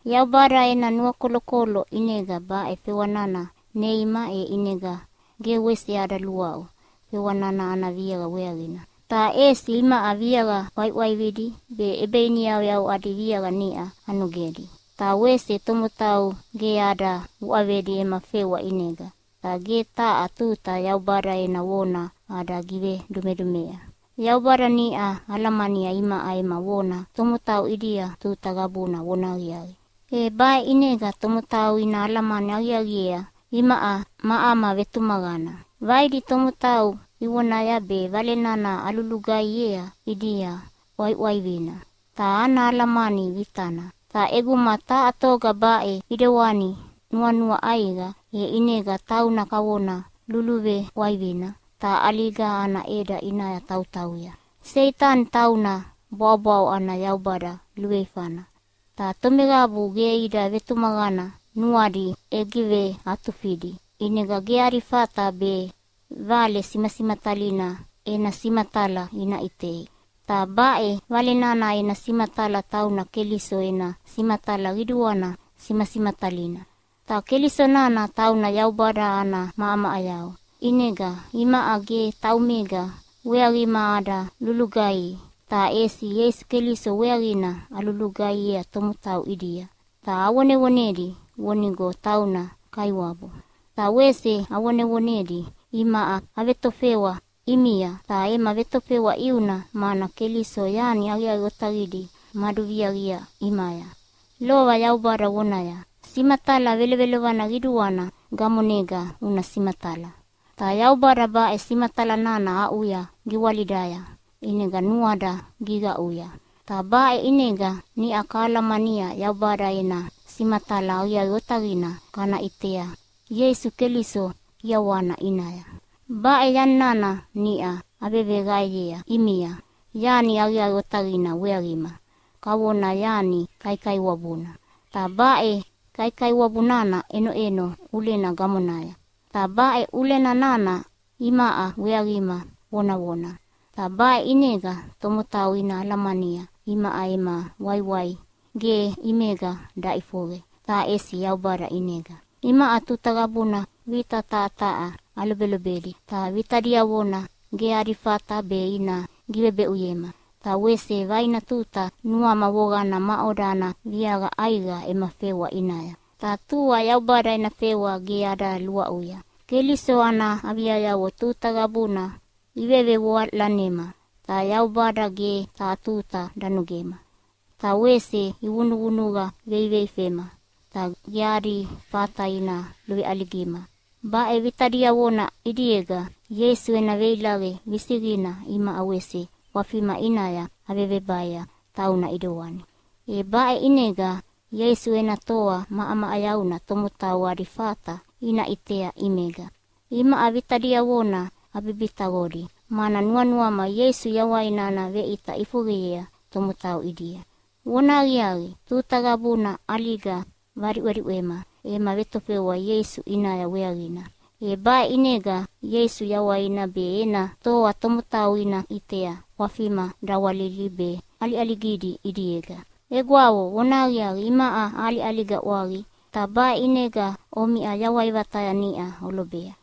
Yaubada ena nuakolokolo ʼinega baʼe fewa nana neima, e ʼinega ge wese ada luaʼu fewa nana ana viaqa weaqina. Ta ʼesi imaʼa viaqa ʼwaiʼwaividi be ʼebeiniyauyau adi viaqa niʼa anogedi. Ta wese tomotau ge ada uʼavedi ema fewa ʼinega, ta ge taha tuta Yaubada ena vona ada givedumedumea. Yaubada niʼa alamania imaʼa ema vona tomotau ʼidia tuta qabuna vonahaqiaqi. E baʼe ʼinega tomotau ina alamani aqiaqiea imaʼa ma ama vetumaqana. Vaidi tomotau ivonaya be Vale nana alulugaihiea ʼidia ʼwaiʼwaivina ta ana alamani vitana. Ta ʼeguma taha toga baʼe ʼidewani nuanua ʼaiqa, e ʼinega tauna kavona luluveʼwaivina ta ʼaliga ana ʼeda ʼinaya tautauya. Seitani tauna bwaʼobwaʼo ana yaubada luveifana, ta tomeqabu ge ida vetumaqana nuadi ʼegiveatufidi, ʼinega ge adi fata be Vale simasimatalina ena simatala ina ʼitei. Ta baʼe Vale nana ena simatala tauna Keliso ena simatala qiduana simasimatalina. Ta Keliso nana tauna Yaubada ana maʼamaʼayau. ʼInega imaʼa ge taumega weaqima ada lulugaihi, ta ʼesi Ieisu Keliso weaqina alulugaihiea tomotau ʼidia, ta avonevonedi vonigo tauna Kaiwabu. Ta wese avonevonedi imaʼa avetofewa ʼimia, ta ema vetofewa ʼiuna, mana Keliso yani aqiaqi otaqidi maduviaqia ʼimaya. Lova Yaubada vonaya, “Simatala, velovelovana qiduana gamonega una simatala!” Ta Yaubada baʼe simatala nana aʼuya giwalidaya ʼinega nuada giqaʼuya, ta baʼe ʼinega niʼa kalamania Yaubada ena simatala aqiaqi otaqina kana ʼitea Ieisu Keliso ʼiawana ʼinaya. Baʼe yani nana niʼa aveqaeyea ʼimia yani aqiaqi otaqina weaqima, kavona yani kaikaiwabuna. Ta baʼe kaikaiwabu nana ʼenoʼeno ʼulena gamonaya. Ta baʼe ʼulena nana imaʼa weaqima vonavona. Ta baʼe ʼinega tomotau ina alamania imaʼa ema waiwai ge ʼimega daʼifoqe, ta ʼesi Yaubada ʼinega. Imaʼa tuta qabuna vita taha taha alobelobedi, ta vita diavona ge adi fata be ina givebeʼuyema. Ta wese vaina tuta nuama voqana maʼoda ana viaqa ʼaiqa ema fewa ʼinaya, ta tua Yaubada ena fewa ge ada luaʼuya. Keliso ana aviayavo tuta qabuna ivevevoalanema, ta Yaubada ge taha tuta danogema. Ta wese ivunuvunuqa veiveifema, ta ge adi fata ina luveʼaligima. Baʼe vita diavona ʼidiega Ieisu ena veilaqe visiqina imaʼa wese ʼwafima ʼinaya avevebaea tauna ʼidewani, e baʼe ʼinega Ieisu ena toa maʼamaʼayauna tomotau adi fata ina ʼitea ʼimega. Imaʼa vita diavona abibitaqodi, mana nuanuama Ieisu yawaina ana veʼita ʼifoqeyea tomotau ʼidia. Vonahaqiaqi, tuta qabuna ʼaliga vadiʼwediʼwema ema vetofewa Ieisu ʼinaya weaqina. E baʼe ʼinega Ieisu yawaina be ena toa tomotau ina ʼitea ʼwafima dawalilidi be ʼaliʼaligidi ʼidiega. Egwavo, vonahaqiaqi, imaʼa aʼaliʼaliga ʼwaqi, ta baʼe ʼinega omiʼa yawai vataya niʼa olobea.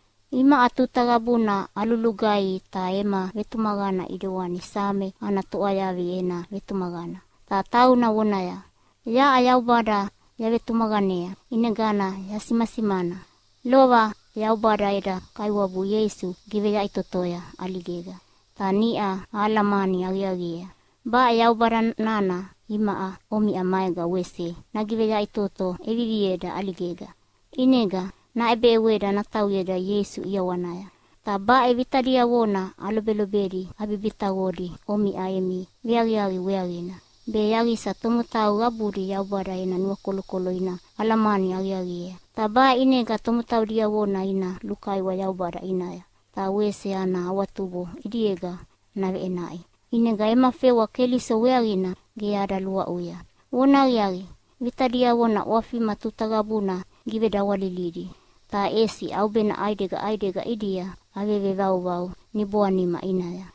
Imaʼa tuta qabuna alulugaihi, ta ema vetumaqana ʼidewani Same ana toʼwayavi ena vetumaqana, ta tauna vonaya, “Yaʼa Yaubada yavetumaqanea, ʼinegana yasimasimana.” Lova Yaubada eda Kaiwabu Ieisu giveyaʼitotoya ʼaligega, ta niʼa ahalamani aqiaqiea baʼe Yaubada nana imaʼa omiʼa maega wese nagiveyaʼitoto ʼevivieda ʼaligega, ʼinega naʼebeʼeweda natauyeda Ieisu ʼiawanaya. Ta baʼe vita diavona alobelobedi abibitaqodi omiʼa emi veaqiaqi weaqina, be yaqisa tomotau qabudi Yaubada ena nuakolokolo ina alamani aqiaqiea. Ta baʼe ʼinega tomotau diavona ina lukaiwa Yaubada ʼinaya, ta wese ana awatubo ʼidiega naveʼenaʼi. ʼInega ema fewa Keliso weaqina ge ada luaʼuya. Vonahaqiaqi, vita diavona ʼwafima tuta qabuna gigivedawalilidi, ta ʼesi ʼaubena ʼaidega ʼaidega ʼidia avevevauvau niboanima ʼinaya.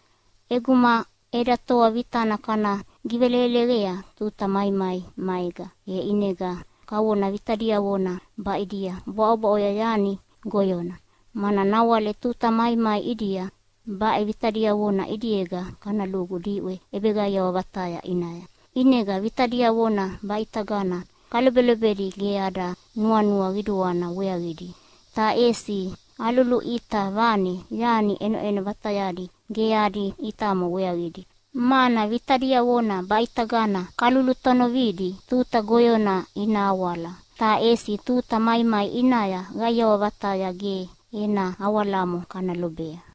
ʼEguma eda toa vitana kana giveleleqea tuta maimai maega, e ʼinega kavona vita diavona baʼidia bwaʼobwaʼoya yani goyona, mana nawale tuta maimai ʼidia baʼe vita diavona ʼidiega kana lugu diʼwe ʼebeqaiawa vataya ʼinaya. ʼInega vita diavona baʼitagana kalobelobedi ge ada nuanua qiduana weaqidi, ta ʼesi aluluʼita vane yani ʼenoʼeno vatayadi ge adi ʼitamo weaqidi. Mana vita diavona baʼitagana kalulutonovidi tuta goyona ina awala, ta ʼesi tuta maimai ʼinaya qaiawa vataya ge ena awalamo kana lobea.